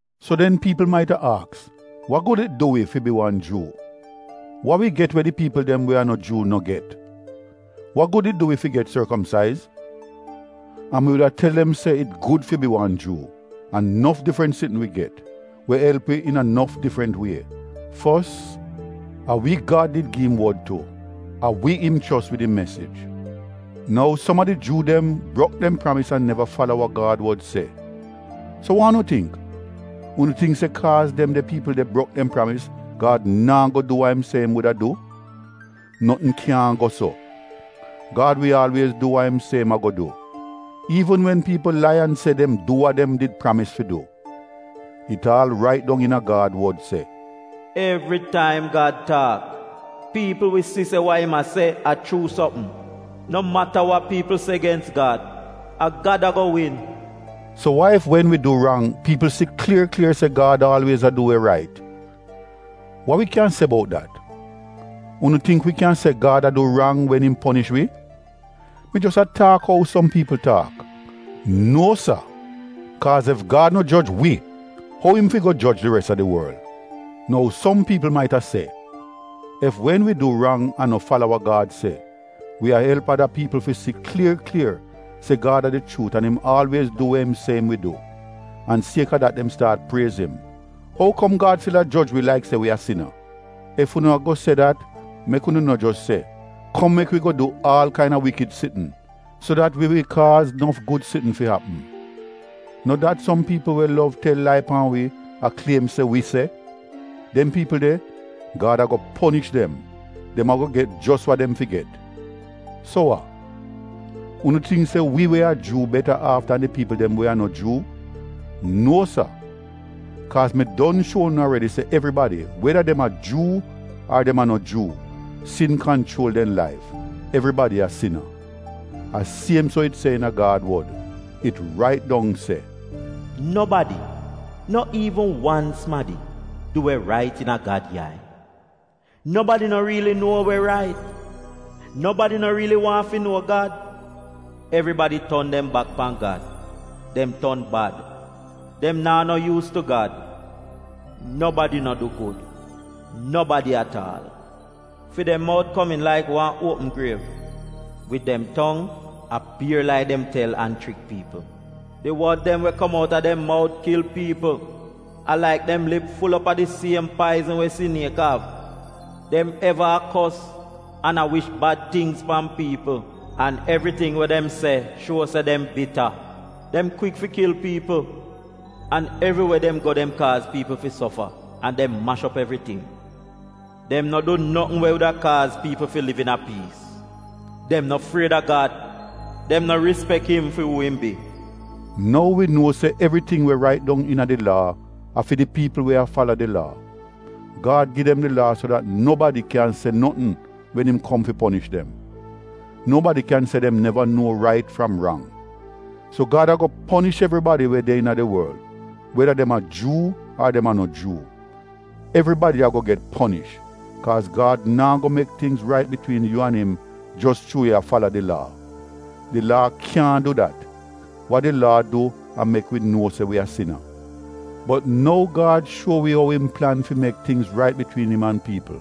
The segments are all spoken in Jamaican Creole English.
So den, piipl mait-a aks, wa gud it du wi, fi bi wan Juu? Wa wi get we di piipl dem we a no Juu no get? Wa gud it du wi fi get sorkomsaiz? An mi wuda tel dem se it gud fi bi wan Juu, a nof difrant sitn wi get, we elp wi iina nof difrant wie. Fos, a wi Gad did gi im Wod tu — a wi im chos wid im mesij. Nou som a di Juu dem brok dem pramis an neva fala wa Gad wod se. So wa unu tingk? Unu tingk se kaaz dem de piipl de brok dem pramis, Gad naa go du wa im se im wuda du? Notn kyaahn go so! Gad wi aalwiez du wa im se im a-go du, iivn wen piipl lai an se dem du wa dem did pramis fi du. It aal rait dong iina Gad wod se: “Evritaim Gad taak, piipl wi si se wa im a se a chuu sopm. No mata wa piipl se gens Gad, a Gad a-go win.” So wa ef wen wi du rang, piipl si klier klier se Gad aalwiez a du we rait? Wa wi kyan se bout dat? Unu tingk wi kyan se Gad a du rang wen im ponish wi? (Mi jos a taak ou som piipl taak) Nuo sa! Kaaz ef Gad no joj wi, ou im fi go joj di res a di worl? Nou som piipl mait-a se, “ef wen wi du rang an no fala we Gad se, wi a elp ada piipl fi si klier klier se Gad a di chuut an im aalwiez du we im se im wi du, an siek-a dat dem staat priez im, ou kom Gad stil a joj wi laik se wi a sina?” Ef unu a go se dat, mek unu no jos se, “Kom mek wi go du aal kain-a wikid sitn, so dat wi wi kaaz nof gud sitn fi apm” — no dat som piipl we lov tel lai pan wi, a kliem se wi se. Dem piipl de, Gad a-go ponish dem — dem a-go get jos wa dem fi get. So wa? Unu tingk se wi we a Juu beta aaf dan di piipl dem we a no Juu? Nuo sa! Kaaz mi don shuo unu aredi se evribadi, weda dem a Juu ar dem a no Juu, sin kanchuol dem laif — evribadi a sina. A siem so it se iina Gad wod. It rait dong se: “Nobadi, no iivn wan sumadi, du we rait iina Gad yai. Nobadi no riili nuo we rait, Nobadi no riili waahn fi nuo Gad. Evribadi ton dem bak pan Gad, dem ton bad — dem naa no yuus tu Gad. Nobadi no du gud. Nobadi at aal!” “Fi dem mout komiin laik wan uopm griev, wid dem tong a bier lai dem tel an chrik piipl. Di wod dem we kom outa dem mout kil piipl, a laik dem lip ful op a di siem paizn we siniek av. Dem eva a kos an a wish bad tingz pan piipl, an evriting wa dem se shuo se dem bita.” “Dem kwik fi kil piipl, an evriwe dem go dem kaaz piipl fi sofa an dem mash op evriting. Dem no du notn we wuda kaaz piipl fi liv iina piis.” “Dem no fried a Gad — dem no rispek im fi uu im bi.” Nou wi nuo se evriting we rait dong iina di Laa a fi di piipl we a fala di Laa. Gad gi dem di Laa so dat nobadi kyan se notn wen im kom fi ponish dem — nobadi kyan se dem neva nuo rait fram rang. So Gad a-go ponish evribadi we de iina di worl, weda dem a Juu ar dem a no Juu. Evribadi a-go get ponish, kaaz Gad naa go mek tingz rait bitwiin yu an im jos chuu yu a fala di Laa. Di Laa kyaahn du dat, wa di Laa du a mek wi nuo se wi a sina. Bot nou Gad shuo wi ou im plan fi mek tingz rait bitwiin im an piipl.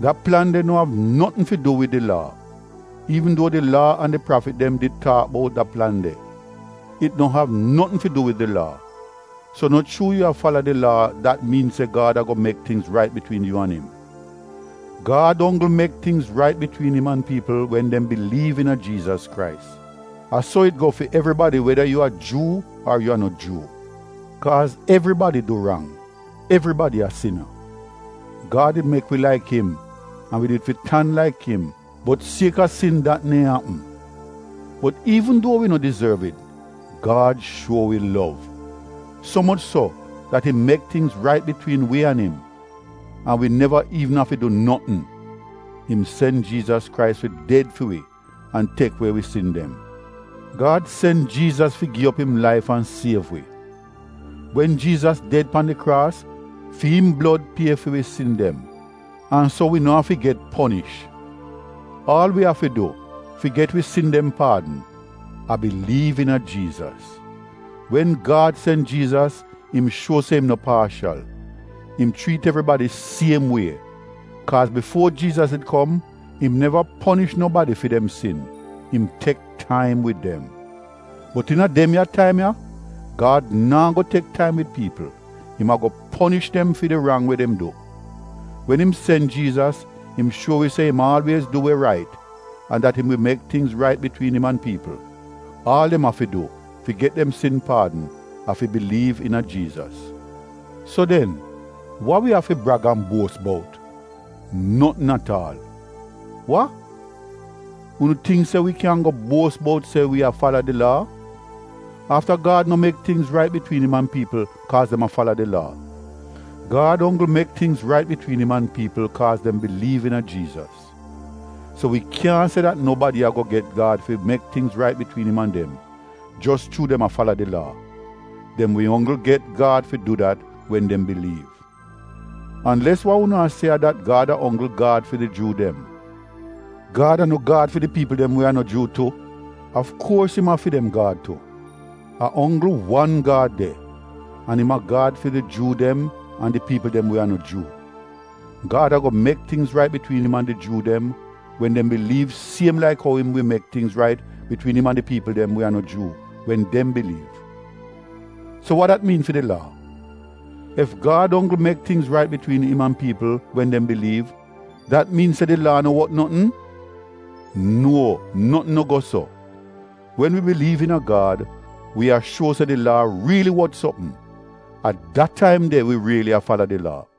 Da plan de no av notn fi du wid di Laa, (iivn duo di Laa an di prafit dem did taak bout da plan de). It no av notn fi du wid di Laa, so no chuu yu a fala di Laa dat miin se Gad a-go mek tingz rait bitwiin yu an im. Gad onggl mek tingz rait bitwiin im an piipl wen dem biliiv iina Jiizas Krais. A so it go fi evribadi weda yu a Juu ar yu a no Juu. Kaaz evribadi du rang — evribadi a sina. Gad did mek wi laik im an wi did fi tan laik im bot siek-a sin dat neehn apm. Bot iivn duo wi no dizorv it, Gad shuo wi lov. So moch so dat im mek tingz rait bitwiin wi an im, an wi neva iivn afi du notn. Im sen Jiizas Krais fi ded fi wi an tek we wi sin dem. Gad sen Jiizas fi gi op im laif an siev wi. Wen Jiizas ded pan di kraas, fi im blod pie fi wi sin dem an so wi no afi get ponish. Aal wi afi du fi get wi sin dem paadn, a biliiv iina Jiizas. Wen Gad sen Jiizas im shuo se im no paashal — im chriit evribadi siem wie, kaaz bifuo Jiizas did kom, im neva ponish nobadi fi dem sin, im tek taim wid dem. Bot iina dem ya taim ya Gad naa go tek taim wid piipl, im a-go ponish dem fi di rang we dem du. Wen im sen Jiizas im shuo wi se im aalwiez du we rait an dat im wi mek tingz rait bitwiin im an piipl, aal dem afi du fi get dem sin dem paadn, a fi biliiv iina Jiizas. So den, wa wi av fi brag an buos bout? Notn at aal! Wa? Unu tingk se wi kyan go buos bout se wi a fala di Laa? Afta Gad no mek tingz rait bitwiin im an piipl kaaz dem a fala di Laa, Gad onggl mek tingz rait bitwiin im an piipl kaaz dem biliiv iina Jiizas. So wi kyaahn se dat nobadi a-go get Gad fi mek tingz rait bitwiin im an dem, jos chuu dem a fala di Laa. Dem wi onggl get Gad fi du dat wen dem biliiv. Anles wa unu a se a dat Gad a onggl Gad fi di Juu dem. Gad a no Gad fi di piipl dem we a no Juu tu? Afkuors im a fi dem Gad tu! A onggl wan Gad de, an a im a Gad fi di Juu dem an di piipl dem we a no Juu. Gad a-go mek tingz rait bitwiin im an di Juu dem wen dem biliiv siem laik ou im wi mek tingz rait bitwiin im an di piipl dem we a no Juu wen dem biliiv. So wa dat miin fi di Laa? Ef Gad onggl mek tingz rait bitwiin im an piipl wen dem biliiv, dat miin se di Laa no wot notn? Nuo notn no go so! Wen wi biliiv iina Gad wi a shuo se di Laa riili wot sopm, a da taim de wi riili a fala di Laa.